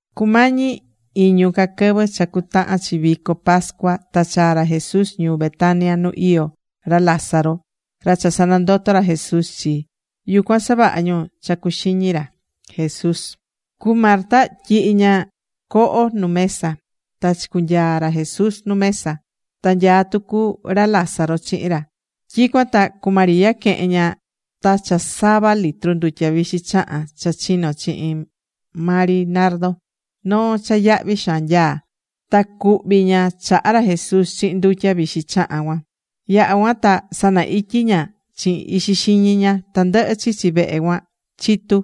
Cumañi iñu ca quɨvɨ cha cuatahan chi vico pascua, ta chaa̱ ra Jesús ñuu Betania nu iyó ra Lázaro, ra cha sanandoto̱ ra Jesús chi. Yucuan savaha̱ ñu cha cuxiñi ra Jesús. Cu Marta tyihi̱ ña coho nu mesa. Ta chicunyaa̱ ra Jesús nu mesa. Ta nyaá tucu ra Lázaro chihin ra. Tyicuan ta cu María quehe̱n ña ta cha sava litro ndutya vixi chahán cha chino̱ chihin maa ri nardo, noo cha yahvi xaan nyaá. Ta cuhvi̱ ña chaha ra Jesús chihin ndutya vixi chahán cuan. Yaha̱ cuan ta sana ityi ña chihin ixi xiñi ña. Tandɨhɨ chichi vehe cuan chitu̱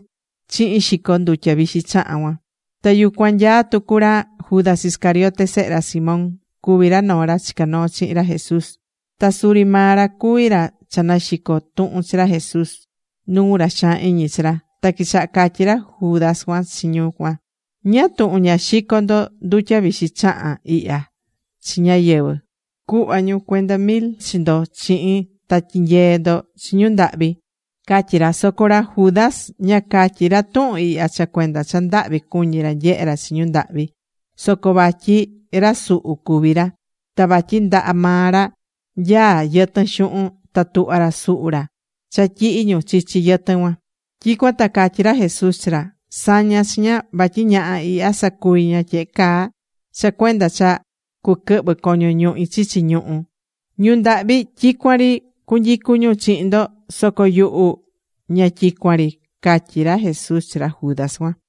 chihin xico ndutya vixi chahán cuan. Ta yucuan nyaá tucu ra Judas Iscariote, sehe ra Simón. Cuví ra noo ra chicá noo chihin ra Jesús. Ta suri maa ra cuví ra cha naxico̱ tuhun chi ra Jesús nuu ra xaan iñi chi ra. Ta quichaha catyí ra Judas cuan chi ñu cuan: ―¿Ñáá tuhun ña xico̱ ndo ndutya vixi chahán ihya chi ñáyɨvɨ, cuhva ñu cuenda mil chi ndo chihin, ta tyinyee ndo chi ñu ndahvi? ―catyí ra. Soco ra Judas ña catyí ra tuhun ihya cha cuenda cha ndahvi cuñí ra nyehe ra chi ñu ndahvi, soco vatyi ra suhu cuví ra. Ta vatyi ndaha maa ra nyaá yɨtɨn xuhun ta tuhvá ra suhu ra cha tyihí ñu chichi yɨtɨn cuan. Tyicuan ta catyí ra Jesús chi ra: ―Sa̱ña chi ña, vatyi ñaha ihya sacuvi̱ ña tyehe caa cha cuenda cha cuquɨhvɨ coño ñuhi chichi ñuhu. Ñu ndahvi tyicuan ri cu cunyicú ñu chihin ndo, soco yuhu ña tyicuan ri ―catyí ra Jesús chi ra Judas cuan.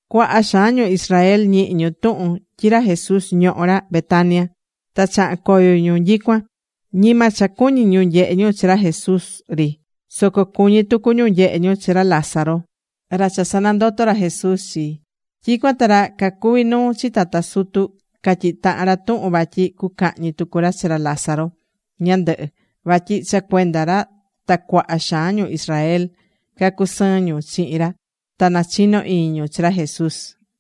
Cuaha xaan ñu Israel ñihi̱ ñu tuhun tyi ra Jesús ñohó ra Betania, ta chaha̱n coyo ñu nyicuan. Ñima cha cuñí ñu nyehe ñu chi ra Jesús ri, soco cuñí tucu ñu nyehe ñu chi ra Lázaro, ra cha sanandoto̱ ra Jesús chi. Tyicuan ta ra cacuví nuu chi tata sutu catyihi̱ tahan ra tuhun vatyi cucahñi tucu ra chi ra Lázaro ñandɨhɨ. Vatyi cha cuenda ra ta cuaha xaan ñu Israel cacusɨɨn ñu chihin ra ta nachino iñi ñu chi ra Jesús.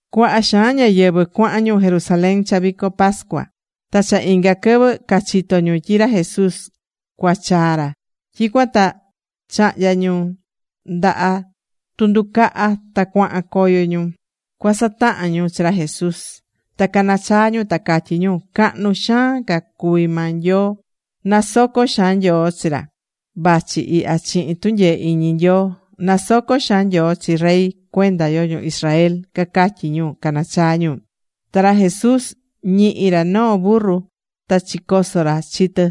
Cuaha xaan ñáyɨvɨ cuahan ñu Jerusalén cha vico pascua. Ta cha inga quɨvɨ cachitó ñu tyi ra Jesús cuachaa ra. Tyicuan ta chahnya̱ ñu ndaha tunducaha ta cuahan coyo ñu cuasatahan ñu chi ra Jesús. Ta canachaa ñu, ta catyí ñu: ―¡Cahnu xaan ca cuví maa Nyoo! ¡Nasoco xaan Nyoo chi ra vachi ihya chihin tunyee iñi Nyoo! ¡Nasoco xaan Nyoo chi Rey cuenda yo ñu Israel! ―cacatyí ñu, canachaa ñu. Ta ra Jesús ñihi̱ ra noo burru ta chicoso̱ ra chi tɨ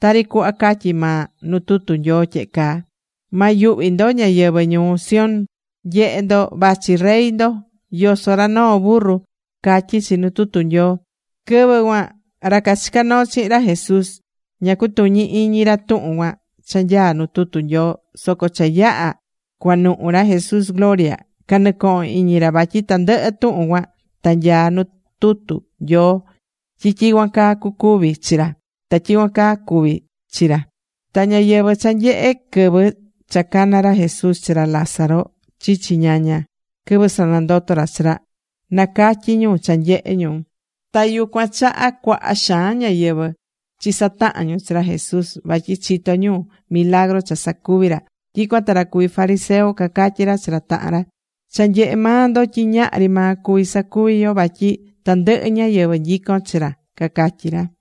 tari cuhva catyí maa nu tutu Nyoo tyehe caa: Ma yuhvi ndo ñáyɨvɨ ñuu Sión Nye̱he ndo, vachi Rey ndo. Yosó ra noo burru ―catyí chi nu tutu Nyoo. Quɨvɨ cuan ra cachicá noo chihin ra Jesús, ña cacutuñí iñi ra tuhun cuan cha nyaá nu tutu Nyoo. Soco cha yaha̱ cuanuhu ra Jesús gloria, canɨcohon iñi ra vatyi tandɨhɨ tuhun cuan ta nyaá nu tutu Nyoo tyi tyicuan caa cucuvi chi ra. Ta tyicuan caa cuvi̱ chi ra. Ta ñáyɨvɨ cha nyehe̱ quɨvɨ cha cana̱ ra Jesús chi ra Lázaro chichi ñaña, quɨvɨ sanandoto̱ ra chi ra, nacatyí ñu cha nyehe̱ ñu. Ta yucuan chaha cuaha xaan ñáyɨvɨ chisataha̱n ñu chi ra Jesús, vatyi chito̱ ñu milagru cha sacuvi̱ ra. Tyicuan ta ra cuví fariseo cacatyí ra chi ra tahan ra: ―Cha nyehé maa ndo tyi ñahri maa cuví sacuví yo, vatyi tandɨhɨ ñáyɨvɨ nyicón chi ra ―cacatyí ra.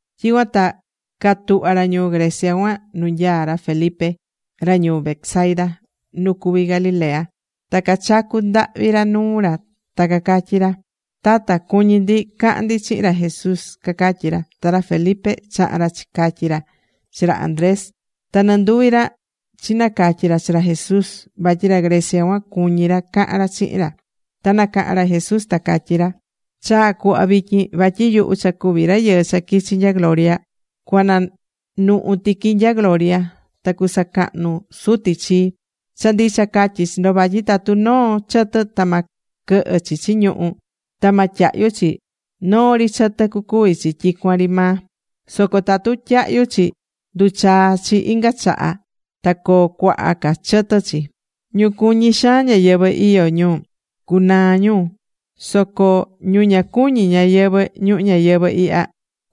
Tyicuan ta catuhva̱ ra ñuu Grecia cuan nu nyaá ra Felipe, ra ñuu Betsaida nu cuví Galilea, ta cachacu̱ ndahvi ra nuu ra ta cacatyí ra: ―Tata, cuñí ndi cahan ndi chihin ra Jesús ―cacatyí ra. Ta ra Felipe chaha̱n ra chicatyi̱ ra chi ra Andrés. Ta nɨnduvi ra chinacatyi̱ ra chi ra Jesús vatyi ra Grecia cuan cuñí ra cahan ra chihin ra. Ta nacaha̱n ra Jesús, ta catyí ra: ―Chaa̱ cuhva vityin vatyi yuhu cha cuví Rayɨɨ cha quichi nya gloria, cuananuhu tiqui nya gloria, ta cusacahnu Suti chii. Cha ndicha catyí chi ndo vatyi tatu noo chɨtɨ ta ma quɨhɨ chichi ñuhú ta ma tyahyu chi, noo ri chɨtɨ cucuvi chi tyicuan ri maa. Soco tatu tyahyu chi, nduchaa chi inga chaha ta coo cuaha ca chɨtɨ chi. Ñu cuñí xaan ñayɨvɨ̱ iyó ñu, cucunaa ñu. Soco ñu ña cuñí ñayɨvɨ̱ ñuhu ñayɨvɨ̱ ihya,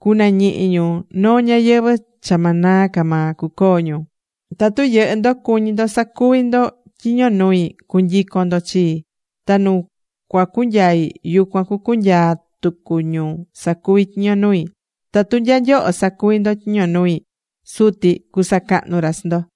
cunañihi ñu noo ñayɨvɨ̱ cha ma naa ca maa cucoo ñu. Tatu yɨhɨ́ ndo cuñí ndo sacuvi ndo tyiño nui, cu̱nyicon ndo chii. Ta nu cuacunyai, yucuan cucunyaa tucu ñu sacuví tyiño nui. Tatu nya nyoho sacuví ndo tyiño nui, Suti cusacahnu ra chi ndo.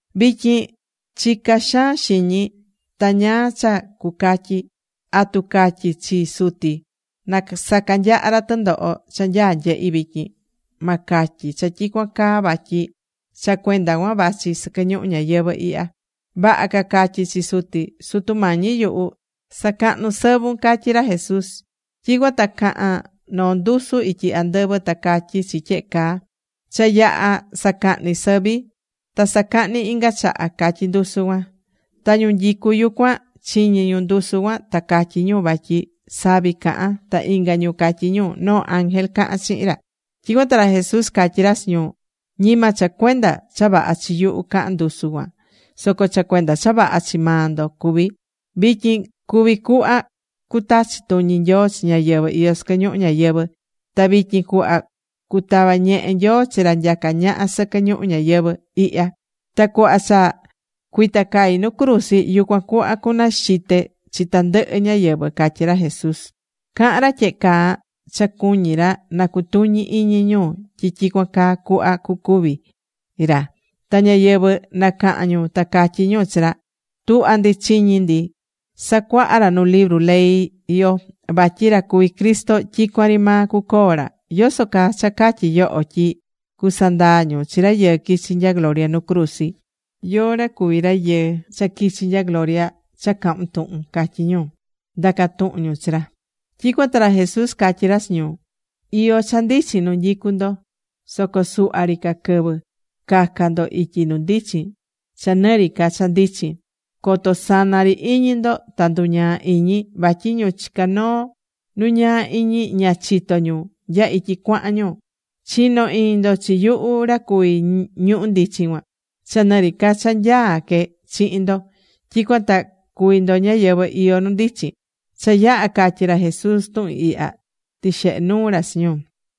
’Vityin chicá xaan xiñi. Ta ¿ñáá cha cucatyi? ¿Atu catyi chi Suti na sacanyaha ra tɨndoho cha nyaá cunyehi vityin? Ma catyi cha tyicuan caa vatyi cha cuenda cuan vachi sɨquɨ ñuhu ñayɨvɨ̱ ihya. Vaha ca catyi chi Suti: “Sutu Mañi yuhu, sa̱cahnu sɨvun” ―catyí ra Jesús. Tyicuan ta caha̱n noo ndusu ityi andɨvɨ ta catyí chi tyehe caa: ―Cha yaha̱ sacahni sɨvi, ta cusacahni inga chaha ―catyí ndusu cuan. Ta ñu nyicú yucuan, chiñi̱ ñu ndusu cuan, ta catyí ñu vatyi savi caha̱n. Ta inga ñu catyí ñu: ―Noo ángel caha̱n chihin ra. Tyicuan ta ra Jesús catyí ra chi ñu: ―Ñima cha cuenda cha vaha chi yuhu caha̱n ndusu cuan soco cha cuenda cha vaha chi maa ndo cuví. Vityin cuví cuhva cutachi tuñi Nyoo chi ñáyɨvɨ iyó sɨquɨ ñuhu ñayɨvɨ̱. Ta vityin cuhva cutava ñehe Nyoo chi ra nyacá ñaha sɨquɨ ñuhu ñayɨvɨ̱ ihya. Ta cuhva cha cuitacai nu cruzi, yucuan cuhva cunaxite chi tandɨhɨ ñáyɨvɨ ―catyí ra Jesús. Cahán ra tyehe caa cha cuñí ra na cutuñi iñi ñu tyi tyicuan caa cuhva cucúvi ra. Ta ñáyɨvɨ nacaha̱n ñu ta catyí ñu chi ra: ―Tuhvá ndi chiñi ndi sacuaha ra nu libru ley yo vatyi ra cuví Cristo tyicuan ri maa cucoo ra. ¿Yoso caa cha catyí yoho tyi cusandaa ñu chi Rayɨɨ quichi nya gloria nu cruzi? ¿Yóó ra cuví Rayɨɨ cha quichi nya gloria cha cahún tuhun? ―catyí ñu, ndacá tuhun ñu chi ra. Tyicuan ta ra Jesús catyí ra chi ñu: ―Iyó cha ndichin nu nyicu ndo, soco suhva ri ca quɨvɨ. Ca̱ca ndo ityi nu ndichin cha ni ri ca cha ndichin. Coto sana ri iñi ndo ta nduñaa iñi, vatyi ñu chicá noo nu ñaa iñi ña chitó ñu nya ityi cuahan ñu. Chi̱no iñi ndo chi yuhu ra cuví ñuhu ndichin cuan, cha nɨ ri ca cha nyaá que chihin ndo. Tyicuan ta cuví ndo ñáyɨvɨ iyó nu ndichin. Cha yaha̱ catyi̱ ra Jesús tuhun ihya tixehe̱ nuu ra chi ñu.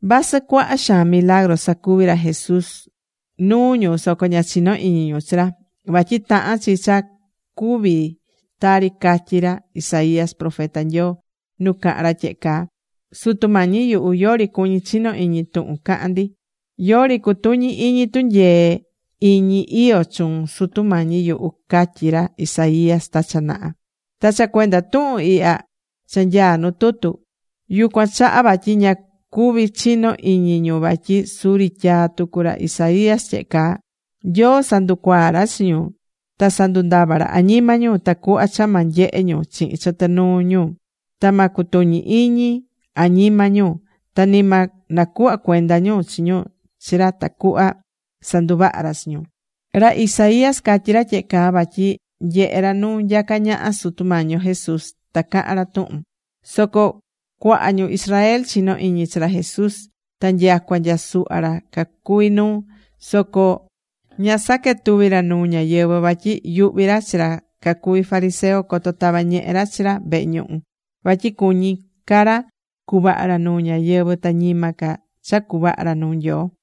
Vasɨ cuaha xaan milagru sacuvi̱ ra Jesús nuu ñu soco ña chinó iñi ñu chi ra. Vatyi tahán chi cha cuví tari catyi̱ ra Isaías profeta Nyoo, nu caha̱n ra tyehe caa: Sutu Mañi yuhu, yori cuñí chino iñi tuhun cahán ndi. Yori cutuñí iñi tunyee iñi iyó chuun, Sutu Mañi yuhu, catyi̱ ra Isaías ta cha naha. Ta cha cuenda tuhun ihya cha nyaá nu tutu, yucuan chaha vatyi ña cuví chino iñi ñu vatyi suri tyaa̱ tucu ra Isaías tyehe caa: Nyoo sanducuaa̱ ra chi ñu. Ta sandundava̱ ra añima ñu, tacuhva cha ma nyehe ñu chihin chɨtɨ nuu ñu, ta ma cutuñi iñi añima ñu, ta ni ma nacuhva cuenda ñu chi ñu chi ra tacuhva sanduvaha ra chi ñu. Ra Isaías catyi̱ ra tyehe caa vatyi nyehe̱ ra nu nyacá ñaha Sutu Mañi yo Jesús ta caha̱n ra tuhun ra. Soco cuaha ñu Israel chinó iñi chi ra Jesús, ta nyacua nya suhva ra cacuví nuu, soco ña saquetuví ra nuu ñáyɨvɨ vatyi yuhví ra chi ra cacuví fariseo coto tava ñehe ra chi ra vehe ñuhu. Vatyi cuñí ca ra cuvaha ra nuu ñáyɨvɨ ta ñima ca cha cuvaha ra nuu Nyoo.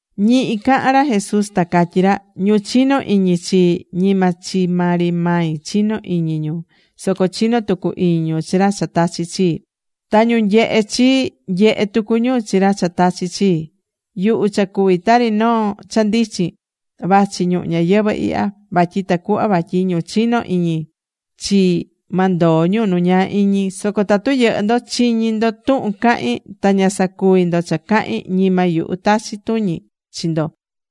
Ñihi cahán ra Jesús, ta catyí ra: ―Ñu chinó iñi chii, ñima chi maa ri mai chinó iñi ñu, soco chinó tucu iñi ñu chi ra cha tachi̱ chii. Ta ñu nyehé chii, nyehé tucu ñu chi ra cha tachi̱ chii. Yuhu cha cuví tari noo cha ndichin vachi ñuhu ñayɨvɨ̱ ihya, vatyi tacuhva vatyi ñu chinó iñi chii ma ndoo ñu nu ñaa iñi. Soco tatu yɨhɨ́ ndo chiñí ndo tuhun cahín, ta ña sacuví ndo cha cahín, ñima yuhu tachi tuñi chi ndo.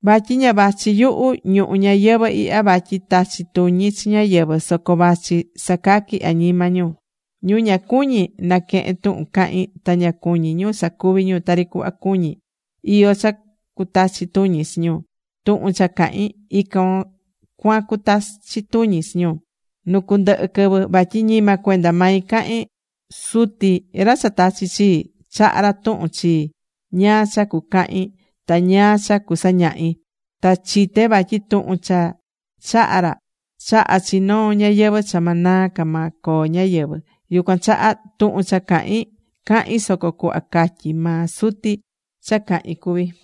Vatyi ña vachi yuhu ñuhu ñayɨvɨ̱ ihya vatyi tachi tuñi chi ñáyɨvɨ. Soco vachi sacaqui añima ñu. Ñu ña cuñí naquehen tuhun cahín ta ña cuñí ñu sacuvi ñu tari cuhva cuñí, iyó cha cutachi tuñi chi ñu. Tuhun cha cahín, ican cuan cutachi tuñi chi ñu nu cundɨhɨ quɨvɨ. Vatyi ñima cuenda mai cahín. Suti ra cha tachi̱ chii, chaha̱ ra tuhun chii ñáá cha cucahin ta ñáá cha cusañahi. Ta chité vatyi tuhun cha chaha̱ ra, chahá chi noo ñayɨvɨ̱ cha ma naa ca maa coo ñáyɨvɨ. Yucuan chaha, tuhun cha cahín, cahín soco cuhva catyí maa Suti cha cahín cuví.